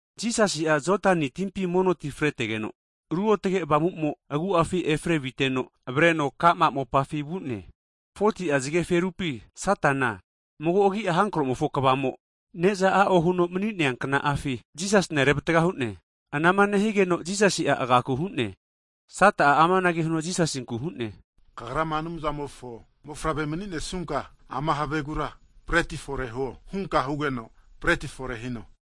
Jisasi'a Jodani timpi mono ti fretegeno, Ruotage Avamumo agu'afi efre viteno avareno ka'ma kopi vu'ne. Hagi 40'a zageferupi Satana mago agi'a hankromofo kvamo, ne'za a'o huno mani'nea kna'afi Jisasina revatga hu'ne. Anama nehigeno Jisasi'a agaku hu'ne. Sata'a amanage huno Jisasinkura hu'ne, Kagrama Anumzamofo mofavre mani'nesnunka ama havegura breti fore huo hunka hugeno breti fore hino.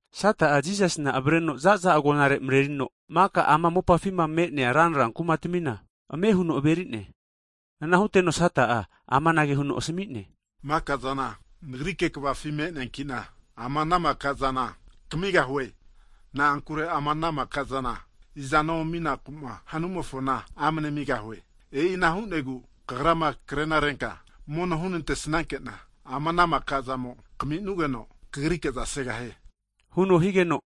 Sata'a Jisasina avareno za'za agonare marerino, maka ama mopafima me'nea ranra kumatamina ame huno averi'ne. Ana huteno Sata'a amanage huno asami'ne, maka'zana nagrike kvafi me'neankina, ama ana makazana kamigahue. Na'ankure ama ana mikazana, izano aminaku'ma hanumofona amane amigahue. E'ina hu'negu kagrama krenarenka mono hunantesankena, ama ana maka'zana kaminugeno kagriza segahie huno higeno,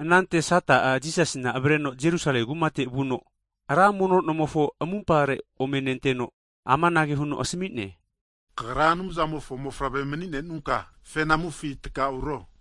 Anante Sata'a Jisasina avareno Jerusalemi kumate vuno, ra mono nomofo amumpare ome nenteno, amanage huno asami'ne, Kagra Anumzamofo mofavre mani'nenunka fenamufi takauro,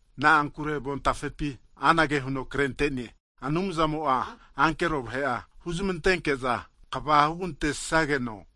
na'ankure avontafepina anage huno krente'ne, Anumzamo'a ankero vahe'a huzmantenke'za kva hugantesageno,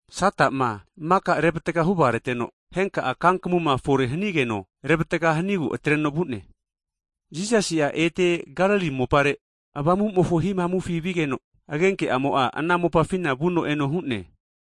Sata'ma mika revatga huvagareteno, henka'a kankamuma fore hanigeno revatga hanigu atreno vu'ne. Jisasi'a ete Galili mopare Avamumofo hihamufi vigeno, agenke'amo ana mopafina vuno eno hu'ne.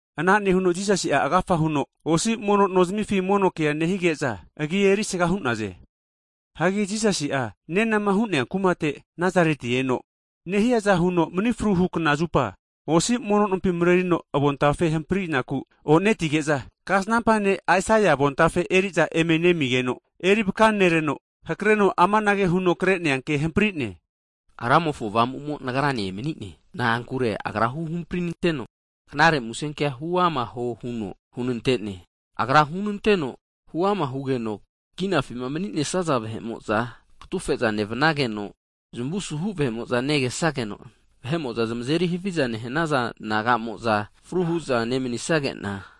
Ana nehuno Jisasi'a, agafa huno osi mono no zimifi mono kea nehige'za, agi erisga hu'naze. Hagi Jisasi'a nenama hu'nea kumate Nazarete eno, nehiaza huno mani fruhu knazupa (sabat) osi mono nompi marerino avontafe hamprinaku o'netige'za, Kasnampa ne' Aisaia avontafe regazarinte'naza eri'za eme nemizageno, eri vakanereno, hakreno amanage huno kre'nea ke hampri'ne, Ramofo avamumo Nagrane emani'ne. Na'ankure agra huhampri nanteno, zamunte omane vahepi Knare Musenkea huama huo huno hunante'ne. Agra hunanteno huama hugeno, kinafi mani'nesaza vahe'mo'za katufe'za nevnageno, zamu suhu vahe'mo'za negesageno, vahe'mo'za zamazeri haviza nehanaza nagamoza fru hu'za nemanisagena,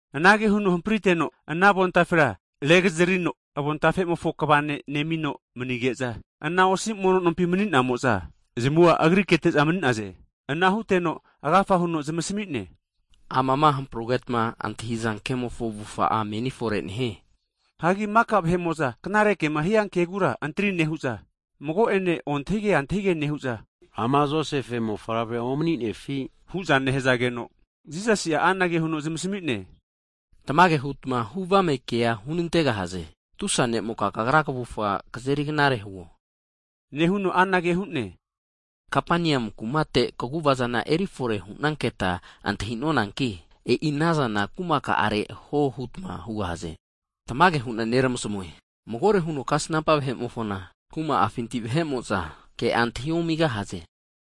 Anage huno hampriteno, ana avontafe regazarino, avontafemofo kva ne' nemino manige'za, ana osi mono nompi mani'namo'za zamua Agri kete'za mani'naze. Ana huteno agafa huno zamasmi'ne, Amama hamprugetma antahiza kemofo avufa'a meni fore nehie. Hagi maka vahe'mo'za knare kema hia kegura antri nehu'za, mago'ene ontahige antahige nehu'za, ama Josefe mofavre omaninefi? hu'za nehazageno, Jisasi'a anage huno zamasami'ne, Tamage hutma huvame kea hunantegahaze. Tusa ne'moka kagra kavufa kazeri knare huo! Nehuno anage hu'ne, Kapeniamu kumate kaguvazama erifore hu'nanketa antahi'nonanki, e'i anazana kumaka'are huo hutma hugahaze. Tamage hu'na neramasamue. Magore huno kasnampa vahe'mofona kuma'afinti vahe'mo'za ke'a antahi omigahaze.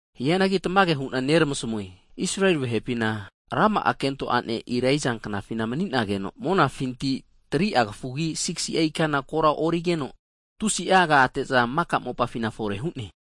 Hianagi tamage hu'na neramasamue, Israeli vahepina rama'a kento'ane Elaija knafina mani'nageno, monafinti 3'a kafugi 6si'a ikana kora origeno, tusi agate'za maka mopafina fore hu'ne.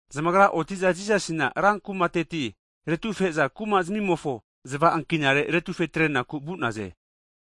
Zamagra oti'za Jisasina rankumateti retufe'za, kuma zamimofo zava ankinareti aretufe atrenaku vu'naze.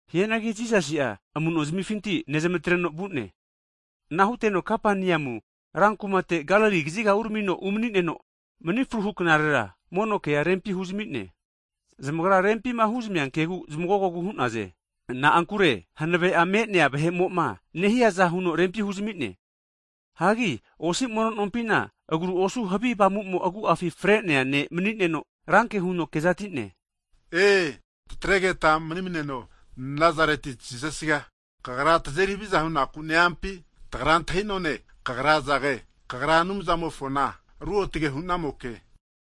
Hianagi Jisasi'a amu'no zimifinti nezamatreno vu'ne. Ana huteno Kapaneamu rankumate Galili kaziga uramino umani'neno, mani fruhu knarera (sabat) mono kea rempi huzami'ne. Zamagra rempima huzamia kegu zmagogogu hu'naze. Na'ankure hanave'a me'nea vahe'mo'ma nehiaza huno rempi huzamine. Hanki osi mono nompina agru osu havi avamumo agu'a fre'nea vahemo mani'neno, ranke huno kezati'ne. Ee! Tatregeta mani'maneno Nazareti Jisasiga, Kagra tazeri haviza hu'naku ne-eampi? Nagra antahi'noe, Kagra izage, Kagra Anumzamofona Ruotage hu'namoke!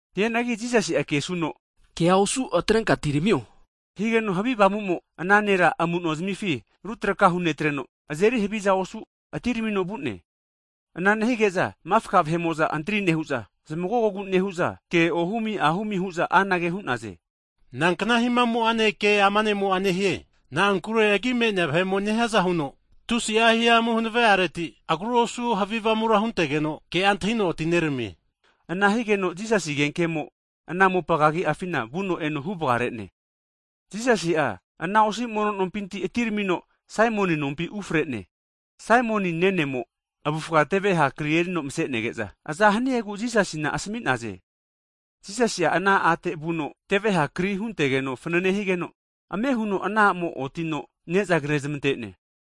Hianagi Jisasi'a kesuno, Kea osu atrenka atiramio! Higeno havi avamumo'a ana nera amuno zimifi rutraka hunetreno, azeri haviza osu atiramino vu'ne. Ana nehige'za mafka vahe'mo'za antri nehu'za zamagogogu nehu'za ke ohumi ahumi hu'za anage hu'naze. Nankna hihamu'ane ke ama ne'mo'a nehie? Na'ankure agi me'nea vahe'mo nehiaza huno tusi'a hihamu hanave'areti, agru osu havi avamura huntegeno ke'a antahino atineramie! Ana higeno Jisasi agenke'amo'a ana mopa kagiafina vuno eno huvagare'ne. Jisasi'a ana osi mono nompinti atiramino Saimon nompi ufre'ne. Saimoni nenemo'a avufga teve ha kri erino mase'nege'za, aza haniegu Jisasina asami'naze. Jisasi'a ana a'te vuno, teveha kri huntegeno fanane higeno, ame huno ana a'mo'a otino ne'za kre'zmante'ne.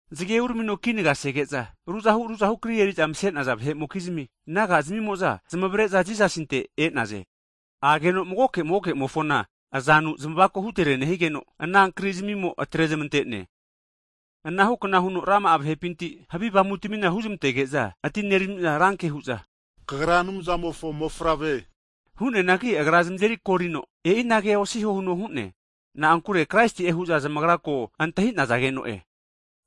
Zage uramino kinaga sege'za, ruzahu ruzahu kri eri'za mase'naza vahe'mokizmia, naga'zmimo'za zamavare'za Jisasinte e'naze. Ageno magoke magoke'mofona azanu zamako hutere huno zamazeri knamaregeno, ana krizmimo atre zamante'ne. Ana hukna huno rama'a vahepinti, havi avamutamina huzmantege'za atinerami'za ranke hu'za, Kagra Anumzamofo mofavre! Hu'neanagi Agra zamazeri korino, e'inage osiho huno hu'ne. Na'ankure Kraisi'e hu'za zamagra ko antahi'nazageno'e.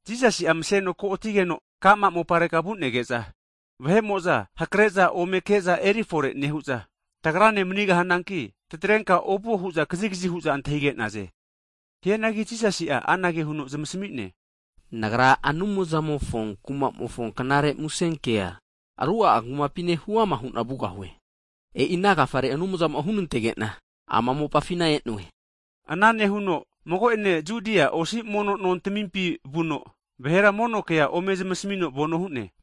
Jisasi'a maseno ko' atigeno ka'ma moparega vu'nege'za, vahe'mo'za hakre'za ome ke'za erifore nehu'za tagrane manigahananki, tatrenka ovuo hu'za kazigazi hu'za antahige'naze. Hianagi Jisasi'a anage huno zamasami'ne, Nagra Anumzamofo kuma'mofo knare musenkea aruga'a kumapine huama hu'na vugahue. E'ina agafare Anumzamo'a hunantege'na ama mopafina e'noe. Anage nehuno mago'ene Judia osi mono nontamimpi vuno, vahera mono kea ome zmasamino vano hu'ne.